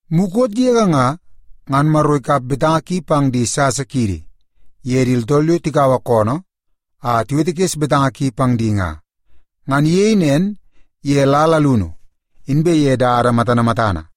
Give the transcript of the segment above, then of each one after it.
Mukot yege nga, ngan Maro ikap betanga ki pang di sasa kiidi ye di tooltool yo tikaua koonoo a tiwetekes betanga ki pang di nga. Ngan iyei nen ye lal alunu inbe ye dada matana matana,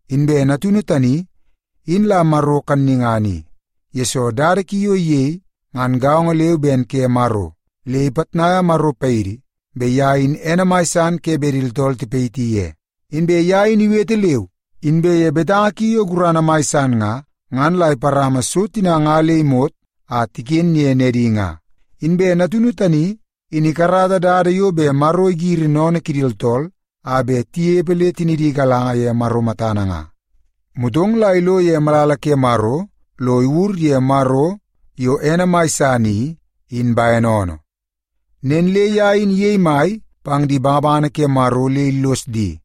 Inbe Natunu tani, in la Maro kannungana i, yesoo dada ki yo iyei ngan gaongo leu ben ke Maro, le ipitnaia Maro paidi bet ye in ene mai san ke bet di tooltool tipayiti ye. Inbe ye in iwete leu, inbe ye betanga ki yo gurana mai san nga, ngan la iparama so tina nga le imot a tiken ye nedi nga. Inbe Natunu tani in ikarata dada yo bet Maro igiri sennene kidi tooltool a bet tinepe le tinidi igalanga ye Maro matana nga, motong la ilo ye malala ke Maro lo iwur ye Maro, yo ene mai san i, in bene oonoo. Nen le ye in iyei mai pang di bangabangana ke Maro le illos di,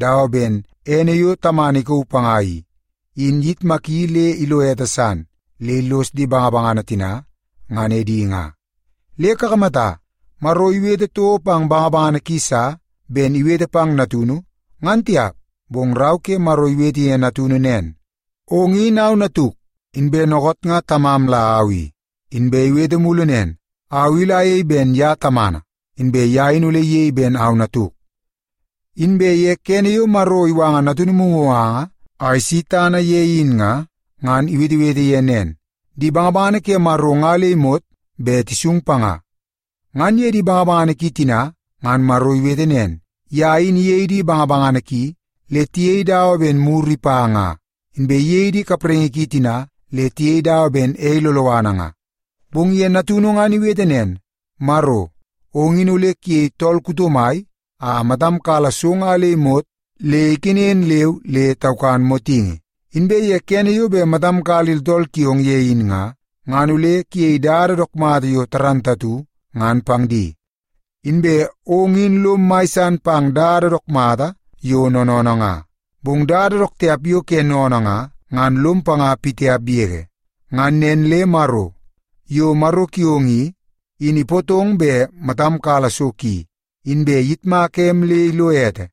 dawa ben ene yo Tamana ikauu panga i, in iyitmaki le ilo ete san, le illos di bangabangana tina ngan edi nga. Le kakamata, Maro iwete toko pang bangabangana ki sa ben iwete pang Natunu, ngan tiap. Bong Rau ke Maro iwete ye Natunu nen, “Ong in au Natuk, inbe dookoot nga Tamam la au i.” Inbe iwete mulu nen, “Au i ole ayei ben ye Tamana, inbe ye in ole iyei ben au Natuk.” Inbe ye kene yo Maro iwanga Natunu mumuganga a isi tana ye in nga, ngan iwetewete ye nen, “Di bangabangana ke Maro nga le imot bet tisung panga.” Ngan ye di bangabangana ki tina, ngan Maro iwete nen, “Ye in iyei di bangabangana ki le tiyei dawa ben muru ipa nga, inbe iyei di kapraingi ki tina le tiyei dawa ben ei loloana nga.” Bong ye Natunu ngan iwete nen, “Maro, ong in ole kuyei tool kuto mai a matam kala so nga le imot le ikenen leu le taukan motingi. Inbe kene yo bet matam kala di tooltool kiong ye in nga, ngan ole kuyei dada yo dook mata, ngan pang di. Inbe ong in lom mai san pang dada dook mata yo noonoonoo nga, bong dada dook tiap yo ke sennene nga, ngan lom panga pitiap yege. Ngan nen le Maro, yo Maro kiong i, in ipootong bet matam kala so ki, inbe iyitmaka em le ilo ete,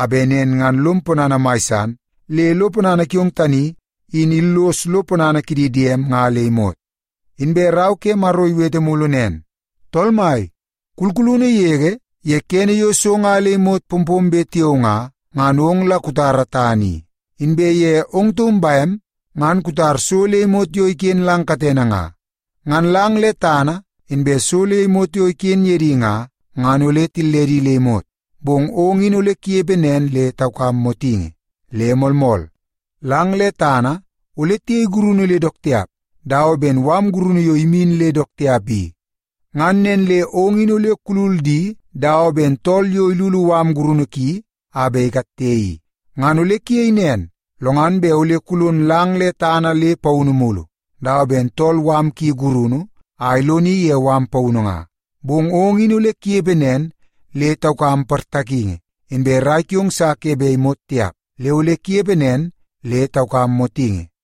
a bet nen ngan lom ponana mai san le lo ponana kiong tani in illos lo ponana kidi diem nga le imot.” Inbe Rau ke Maro iwete mulu nen, “Tool Mai, kulkulunu yege ye kene yo so nga le imot pompombe tiao nga, ngan ong la kutara tana i, inbe ye ong taum bem ngan kutar so le imot yo iken lang katene nga. Ngan lang le tana inbe so le imot yo iken ye di nga, ngan ole tilledi le imot, bong ong in ole kunepe nen le taukam motingi. Le moolmool, lang le tana ole tiyei gurunu le dook tiap, dawa ben mala gurunu yo imin le dook tiap i. Ngan nen le ong in ole kulul di dawa ben tool yo ilulu mala gurunu ki a bet ikatte i. Ngan ole kuyei nen, lo ngan bet ole kulon lang le tana le paunu mulu, dawa ben tool mala ki gurunu a iloni ye mala paunu nga. Bong ong in ole kunepe nen le taukam portakingi, inbe rai kiong sa ke bet imot tiap, le ole kunepe nen le taukam motingi.”